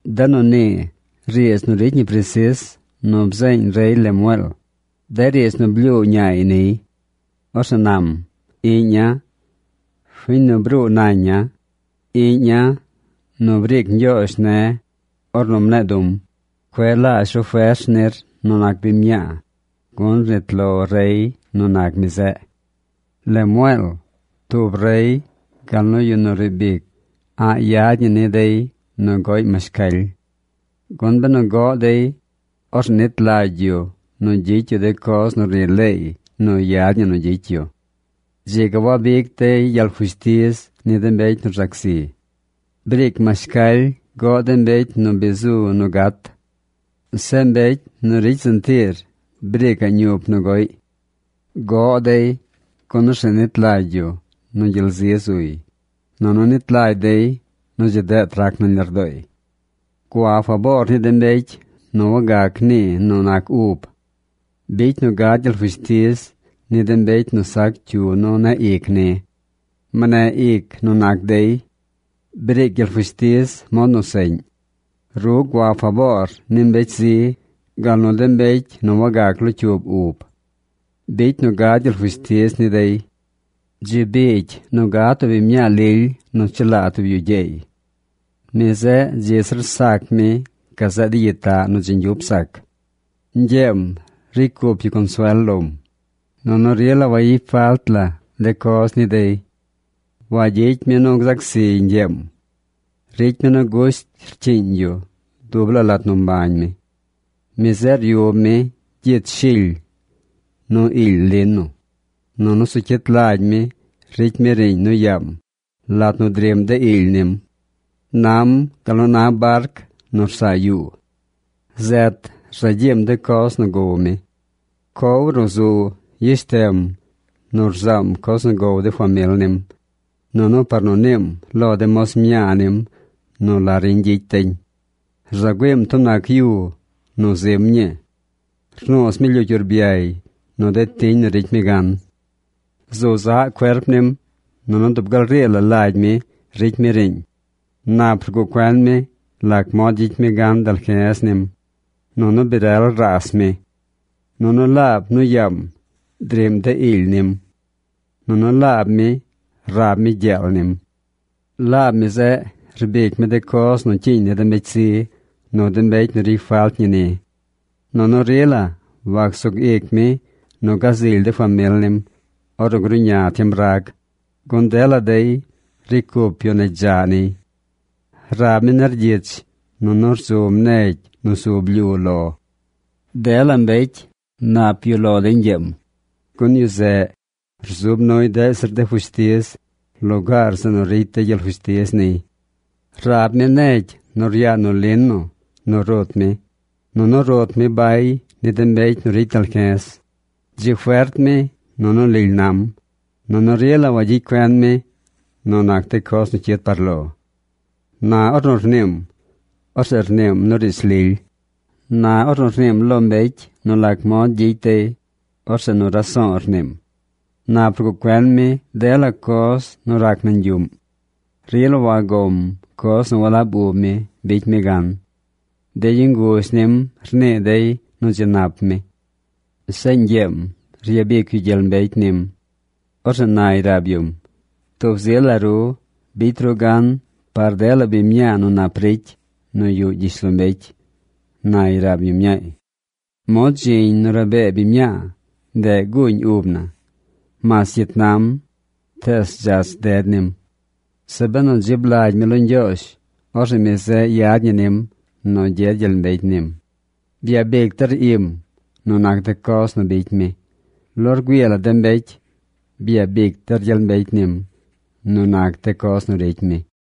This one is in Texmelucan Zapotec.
De nu nii riidz nu ricy ñi presis nu bzeeñ rey Lemueel, de riidz nu blyuu ñaay niy. Orzeꞌ nam: Iꞌña̱, fiñ nu bruu naña̱, iꞌña̱ nu briic Ñgyoozh ne̱ ornu mne̱e̱ du̱m, cueꞌ laazh ru fers nir nu nac biñ mñaa, gun rnit lo rey nu nac mi zeꞌ. Lemueel, tub rey gal nu yu nu riib ic a̱ꞌ yad ñi ni dey nu goꞌy mashcaly. Gun benu goꞌ dey, orzeꞌ nit lagy yu nu gyicy yu de coz nu rnii leey nu yad ñi nu gyicy yu. Dzi ga wabic dey gyel fushtiz ni de mbecy nu rzac zi. Briic mashcaly goꞌ de mbecy nu bi zu nu gat. Zeꞌ mbecy nu ricy sentiir briicaꞌ ñup nu goꞌy. Goꞌ dey, gun orzeꞌ nit lagy yu nu gyel zi zuy, nunu nit lagy dey nu dzi deet rac nañ lardooy. Gua faboor ni de mbecy nu wagac nii nu nac ub. Bicy nu gad gyel fushtiz ni de mbecy nu sac cyu nu ne̱ꞌ ic ni. Mneꞌ ic nu nac dey. Briic gyel fushtiz mod nu seꞌñ. Ru gua faboor ni mbecy zi gal nu de mbecy nu wagac locyuub ub. Bicy nu gad gyel fushtiz ni dey. Dzi biigy nu gad tub biñ mñaa lily nu chelaa tub yu gyeey. Mi zeꞌ dzi zir sac mi gazeꞌ de gyitaꞌ nu dzi ñgyup sac. Ñgyeem ricy cup yu consuel lom, nunu rila wayicy falt la de coz ni dey. Wagyicy mi nu gzac zi ñgyeem. Ricy mi nu gusht rcyiiñ yu dub laa lat nu mbañ mi. Mi zeꞌ ryub mi gyich shily, nu iily lino, nunu zu cyit lagy mi ricy mi riiñ nu yaam lat nu driꞌm de iily nim. Nam gal nu na barc nu rsaa yuu. Zet rza gyiim de coz nu gow mi. Cow ruꞌ zu yeshtem nu rzaam coz nu gow de famil nim, nunu par nu niim lo de moz mñaa nim nu la riñ gyicy deñ. Rza güiim tub nac yu nu zim ñii. Rnuuz mi lyucy urbyay nu de tiñ nu ricy mi gan. Zu zaꞌ cuerp nim, nunu dub gal rii la lagy mi ricy mi riiñ. Nap rguꞌ cuen mi lac mod gyicy mi gan dalje̱z nim. Nunu bi rel raas mi. Nunu laab nu yaam driꞌm de iily nim. Nunu laab mi rab mi gyeel nim. Laab mi zeꞌ rbic mi de coz nu cyiiñ ni de mbecy zi nu de mbecy nu ricy falt ñi ni. Nunu rila wac sug ic mi nu gazily de famil nim ornu gruꞌña tiem rag, gun dela dey ricy cup yu negy dzaꞌ niy. Rab mi nergyich nunu rzum negy nu zu blyu lo. Dela mbecy nap yuꞌ lo dey ñgyeem, gun yu zeꞌ rzub nuy deꞌ zir de fushtiz lugaar zeꞌ nu ricy dey gyel fushtiz niy. Rab mi negy nu ryaa nu lino nu rut mi, nunu rut mi bay ni de mbecy nu ricy dalge̱z. Dzi fert mi, nunu lily nam, nunu rila wagyicy cuen mi nu nac de coz nu cyid par lo. Na ornu rniim, orzeꞌ rniim nu riidz lily. Na ornu rniim lo mbecy nu lac mod gyicy dey, orzeꞌ nu raso̱o̱ rniim. Nap rguꞌ cuen mi dela coz nu rac nañ yuꞌm. Rila wagom coz nu walab ub mi bicy mi gan. De yu nguzh nim rnii dey nu dzi nap mi. Zeꞌ ñgyeem ryabic yu gyel mbecy nim. Orzeꞌ nay rab yum: “Tub zi la ru bicy ru gan par dela biñ mñaa nu nap ricy nu yuꞌ gyishlombecy”, nay rab yu mñaay. Mod dziñ nu rabee biñ mñaa, ndeꞌ guuñ ub na. Mas cyit nam, tees dzach ded nim. Zeꞌ benu rdzib lagy mi lo Ñgyoozh, orzeꞌ mi zeꞌ yad ñi nim nu gyed gyel mbecy nim. Byabic der im nu nac de coz nu bicy mi. Lo rgüii la de mbecy byabic der gyel mbecy nim nu nac de coz nu ricy mi.